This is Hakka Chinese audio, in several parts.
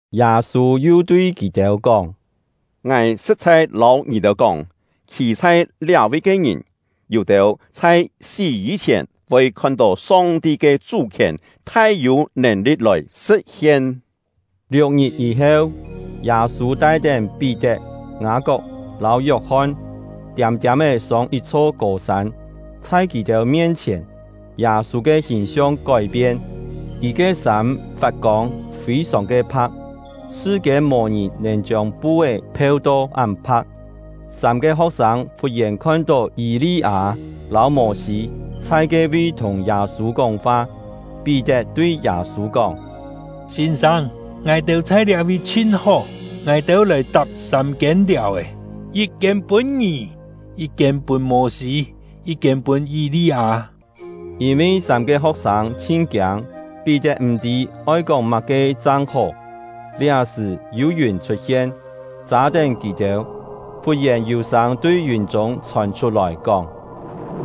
Yâ-sû yu tui kì-têu kóng: “Ngài sṳ̍t-chhai lâu ngì-têu kóng, khî chhai liá-vi ke ngìn, yû-têu chhai sí yî-chhièn voi khon-tó Song-ti ke chú-khièn thai-yû nèn-li̍t lòi sṳ̍t-hien.” Liuk-ngit yî-heu, Yâ-sû tai-tén Pí-tet, Ngâ-kok lâu Yok-hon, tiâm-tiâm-é sông yit-chho kô-sân. Chhai kì-têu mien-chhièn, Yâ-sû ke hìn-siong kói-pien: Kì ke sâm fat-kông, fî-sòng ke pha̍k, sṳ-kiên mò-ngìn nèn chiông pu-é pheu-to án pha̍k. Sâm-ke ho̍k-sâng fut-yèn khon-tó Yî-li-â lâu Mô-sî chhai ke-vi thùng Yâ-sû kóng-fa. Pí-tet tui Yâ-sû kóng: “Sîn-sâng, ngài-têu chhai liá-vi chhin hó! Ngài-têu lòi tap sâm-kiên liàu-è, yit-kiên pûn ngì, yit-kiên pûn Mô-sî, yit-kiên pûn Yî-li-â.” Yîn-vi sâm-ke ho̍k-sâng chhin kiâng, Pí-tet m̀-tî oi kóng má-ke chang hó. Liá-sṳ̀ yû yùn chhut-hien, châ-tén kì-têu. Fut-yèn yû sâng tui yùn-chûng chhòn chhut-lòi kóng: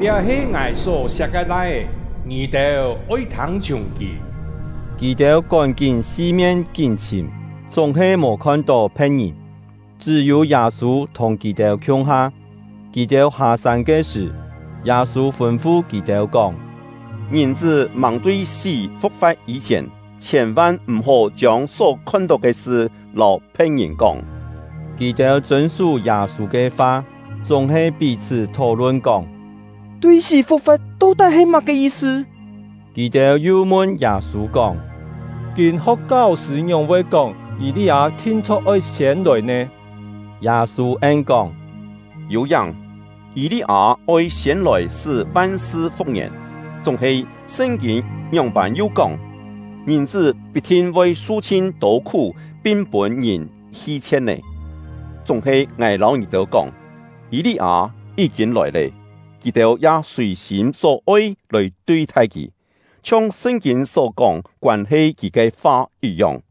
“Liá he Ngài só-siak ke Lai-é. Ngì-têu oi thâng-chhiùng kì!” Kì-têu kón-kín si-mien kín-chhìm, chúng-he mò khon-tó phe̍t-ngìn, chṳ́-yû Yâ-sû thùng kì-têu khiung-ha. Kì-têu hâ-sân ke sṳ̀, Yâ-sû fûn-fu kì-têu kóng: “Ngìn-chṳ́ màng tui sí fu̍k-fa̍t yî-chhièn, chhiên-van m̀-hó chiông só khon-tó ke sṳ lâu phe̍t-ngìn kóng.” Kì-têu chûn-sú Yâ-sû ke fa, chúng-he pí-chhṳ́ thó-lun kóng: “Tui sí fu̍k-fa̍t to-tái he má-ke yi-sṳ?” Kì-têu yu mun Yâ-sû kóng: “Kîn-ho̍k kau-sṳ̂ ngióng-voi kóng, Yî-li-â thin-chho̍k oi siên lòi nè?” Yâ-sû en-kóng: “Yû-yáng, Yî-li-â oi siên lòi sṳ́ van-sṳ fu̍k-ngièn; chúng-he Sṳn-kîn ngióng-pân yu kóng, Ngìn-chṳ́ pit-thin voi su chhin-tô khú pin pûn-ngìn hi-chhie̍t nè? Chúng-he ngài lâu ngì-têu kóng, Yî-li-â yí-kîn lòi lé; kì-têu ya sùi-sîm só-oi lòi tui-thai kì, chhiong Sṳn-kîn só kóng koân-he kì ke fa yit-yong.”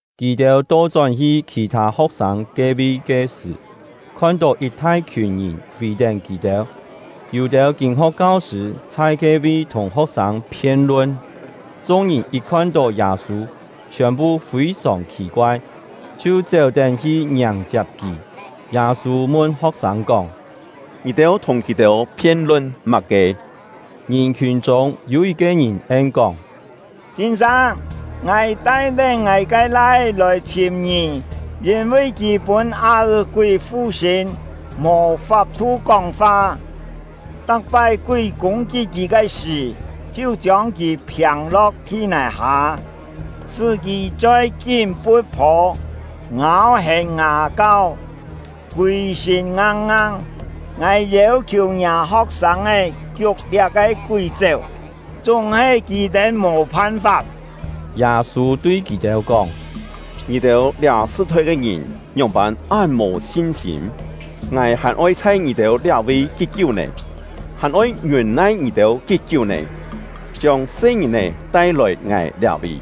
Kì-têu to-chón-hi khì-thâ ho̍k-sâng ke-vi ke sṳ̀, khon-tó yit thai-khiùn ngìn vì-tén kì-têu. Yû-têu kîn-ho̍k kau-sṳ̂ chhai ke-vi thùng ho̍k-sâng phien-lun. Chung-ngìn yit khon-tó Yâ-sû, chhiòn-phu fî-sòng khì-koai, chhiu chéu-tén hi ngiàng-chiap kì. Yâ-sû mun ho̍k-sâng kóng: “Ngì-têu thùng kì-têu phien-lun má-ke?” Ngìn-khiùn chûng yû yit-ke ngìn en-kóng: “Sîn-sâng, ngài tai-tén ngài ke lai-é lòi chhìm ngì; yîn-vi kì pûn á-è-kúi fu-sṳ̂n, mò fap-thu kóng-fa. Tak-pái kúi kûng-kit kì ke sṳ̀, chhiu chiông kì phiâng-lo̍k thi-nài-hâ, sṳ́ kì choi kín pu̍t-phô, ngâu-hèn ngà-kau, kûi-sṳ̂n ngang-ngang. Ngài yêu-khiù ngiâ ho̍k-sâng kiuk liá-ke kúi chéu, chúng-he kì-têu mò phan-fap.” Yâ-sû tui kì-têu kóng: “Ngì-têu liá sṳ-thoi ke ngìn ngióng-pân án mò sin-sîm! Ngài hàn oi chhai ngì-têu liá-vi kí-kiú nè? Hàn oi ngiûn-nai ngì-têu kí-kiú nè? Chiông se-ngìn-è tai-lòi ngài liá-vi!”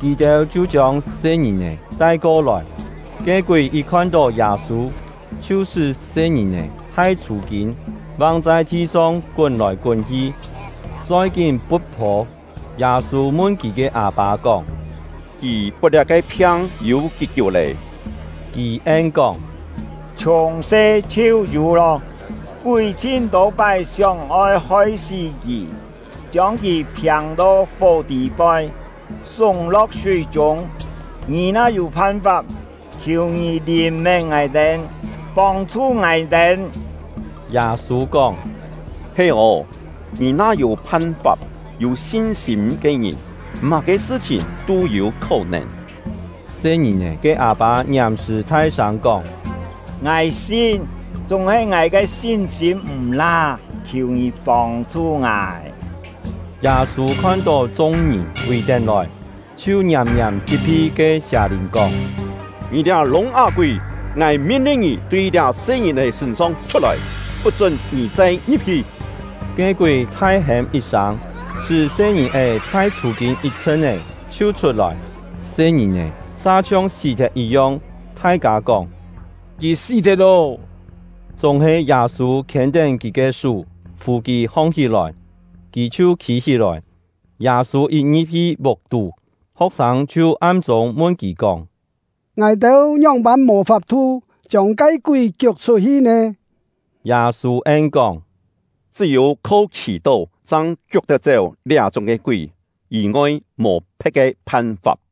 Kì-têu chhiu chiông se-ngìn-è tai-ko-lòi. Ke kúi yit khon-tó Yâ-sû, chhiu sṳ́ se-ngìn-è thai chhû-kîn, vang chhai thi-song kún-lòi kún-hi, choi kín pu̍t-phô. Yâ-sû mun kì ke â-pâ kóng: “Kì pot liá-ke phiang yû kí-kiú lé?” Kì en-kóng: “Chhiùng se chhiu yû lô. Kúi chhin-tô pái sióng-oi hoi-sí kì, chiông kì phiâng-to fó tî-poi, súng-lo̍k súi-chûng. Ngì na yû phan-fap, khiù ngì lìn-mén ngài-têu, pông-chhu ngài-têu!” Yâ-sû kóng: “He ô, ngì na yû phan-fap! Yû sin-sîm ke ngìn, má-ke sṳ-chhìn tû yû khó-nèn.” Se-ngìn-è ke â-pâ ngiàm-sṳ̀ thai-sâng kóng: “Ngài sin, chúng-he ngài ke sin-sîm m̀-la, khiù ngì pông-chhu ngài!” Yâ-sû khon-tó chung-ngìn vì-tén lòi, chhiu ngiàm-ngiàm chit-phi ke sià-lìn kóng: “Ngì liá lûng-á-kúi, ngài min-lin ngì tui liá se-ngìn-è sṳ̂n-song chhut-lòi, put-chún ngì chai ngi̍p-hi!” Ke kúi thai-hêm yit-sâng, sṳ́ se-ngìn-è thai chhû-kîn yit-chhṳn-é, chhiu chhut-lòi. Se-ngìn-è sa chhiong sí-thet yit-yong; thai-kâ kóng: “Kì sí-thet lô!” Chúng-he Yâ-sû khiên-tén kì ke sú, fù kì hong-hí-lòi, kì chhiu khî-hí-lòi. Yâ-sû yit ngi̍p-hi vuk-tú, ho̍k-sâng chhiu am-chûng mun kì kóng: “Ngài-têu ngióng-pân mò fap-thu chiông ke kúi kiuk chhut-hi nè?” Yâ-sû en-kóng: “Chṳ́-yû kho khì-tó chang kiuk tet-chéu liá-chúng ke kúi, yî-ngoi mò phe̍t ke phan-fap.”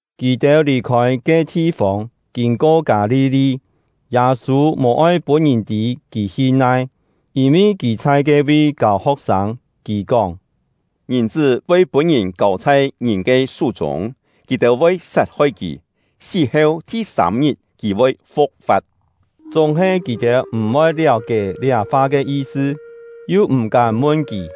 Kì-têu lì-khôi ke thi-fông, kîn-ko Kâ-li-li. Yâ-sû mò-oi pûn ngìn tî kì hi nai, yîn-vi kì chhai ke-vi kâu ho̍k-sâng. Kì kóng: “Ngìn-chṳ́ voi pûn-ngìn kâu chhai ngìn ke sú-chûng; kì-têu voi sat-hoi kì; sí-heu thi-sâm-ngit kì voi fu̍k-fa̍t.” Chúng-he kì-têu m̀-voi liáu-kié liá fa ke yi-sṳ, yu m̀-kám mun kì.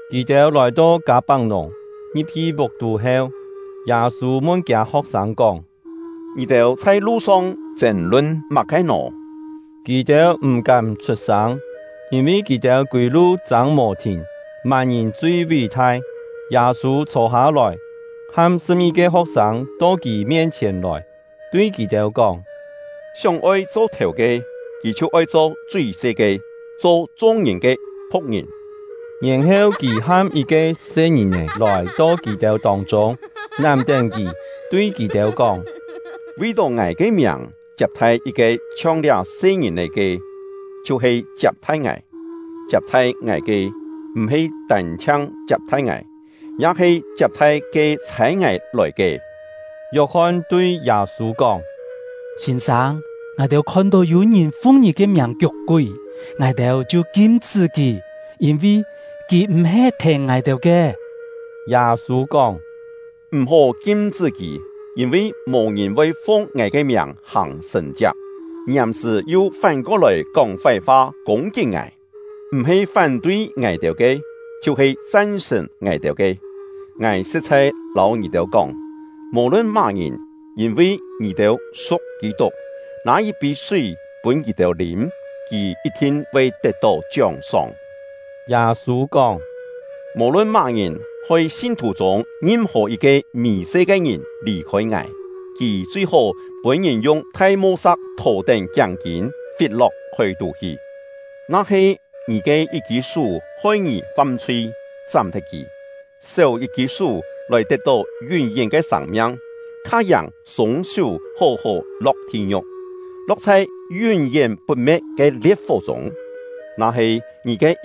Kì-têu lòi-to Kâ-pak-nùng, ngi̍p-hi vuk-tú heu, Yâ-sû mun kiâ ho̍k-sâng kóng: “Ngì-têu chhai lu-song chên-lun má-ke nò?” Kì-têu m̀-kám chhut-sâng, yîn-vi kì-têu kûi-lu châng mò-thìn: Má-ngìn chui ví-thai. Yâ-sû chhô-hâ-lòi, ham sṳ̍p-ngi-ke ho̍k-sâng to kì mien-chhièn lòi, tui kì-têu kóng: “Sióng-oi cho thèu ke, kì chhiu oi cho chui-se ke, cho chung-ngìn ke phu̍k-ngìn.” Yèn-heu kì ham yit-ke se-ngìn-è lòi-to kì-têu tông-chûng, nám-tén kì, tui kì-têu kóng: “Vi-tó ngài ke miàng chiap-thai yit-ke chhiong liá se-ngìn-è ke, chhiu-he chiap-thai ngài. Chiap-thai ngài ke, m̀-he tân-chhiang chiap-thai ngài, ya he chiap-thai ke chhâi ngài lòi ke.” Yok-hon tui Yâ-sû kóng: “Sîn-sâng, ngài-têu khon-tó yû-ngìn fung ngì ke miàng kiuk-kúi, ngài-têu chhiu kim-chṳ́ kì, yîn-vi kì m̀-he thèn ngài-têu ke.” Yâ-sû kóng: “M̀-hó kim-chṳ́ kì; yîn-vi mò ngìn voi fung ngài ke miàng hàng sṳ̀n-chiak, ngiàm-sṳ̀ yu fán-ko-lòi kóng fái-fa kûng-kit ngài. M̀-he fán-tui ngài-têu ke, chhiu-he chan-sṳ̀n ngài-têu ke. Ngài sṳ̍t-chhai lâu ngì-têu kóng, mò-lun má-ngìn, yîn-vi ngì-têu su̍k Kî-tuk, nâ yit-pî súi pûn ngì-têu lîm, kì yit-thin voi tet-tó chióng-sóng.” Yâ-sû kóng: “Mò-lun má-ngìn hoi sin-thù chûng ngim-hò yit-ke mì-se ke ngìn lì-khôi ngài, kì chui-hó pûn-ngìn yung thai mo-sa̍k thò-tén kiáng-kîn, fit-lo̍k hói-tú hi. Na-he ngì ke yit-kî sú hoi ngì fam-chhui, chám-thet kì! Séu yit-kî sú lòi tet-tó yún-yén ke sâng-miang, kha-yàng sûng-sú hó-hó lo̍k thi-ngiu̍k, lo̍k chhai yún-yén put-me̍t ke lie̍t-fó chûng. Yû-têu kú-kién kâ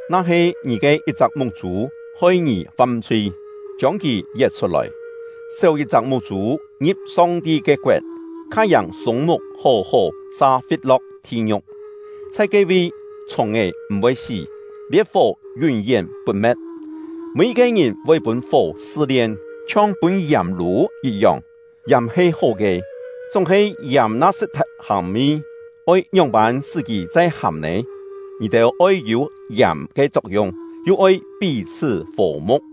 Na-he ngì ke yit-chak muk-chû hoi ngì fam-chhui, chiông kì yet-chhut-lòi! Séu yit-chak muk-chû ngi̍p Song-ti ke koet, kha-yàng sûng-muk hó-hó sa fit-lo̍k thi-ngiu̍k. Chhai ke-vi, chhùng-è m̀-voi sí, lie̍t-fó yún-yén put-me̍t. “Mî-yit-ke ngìn voi pûn fó sṳ-lien, chhiong pûn yàm lû yit-yong. Yàm he hó ke, chúng-he yàm na sṳt-thet hàm-mi, oi ngióng-pân sṳ́ kì chai hàm nè? Ngì-têu oi yû yàm ke chok-yung, yu oi pí-chhṳ́ fò-mu̍k.”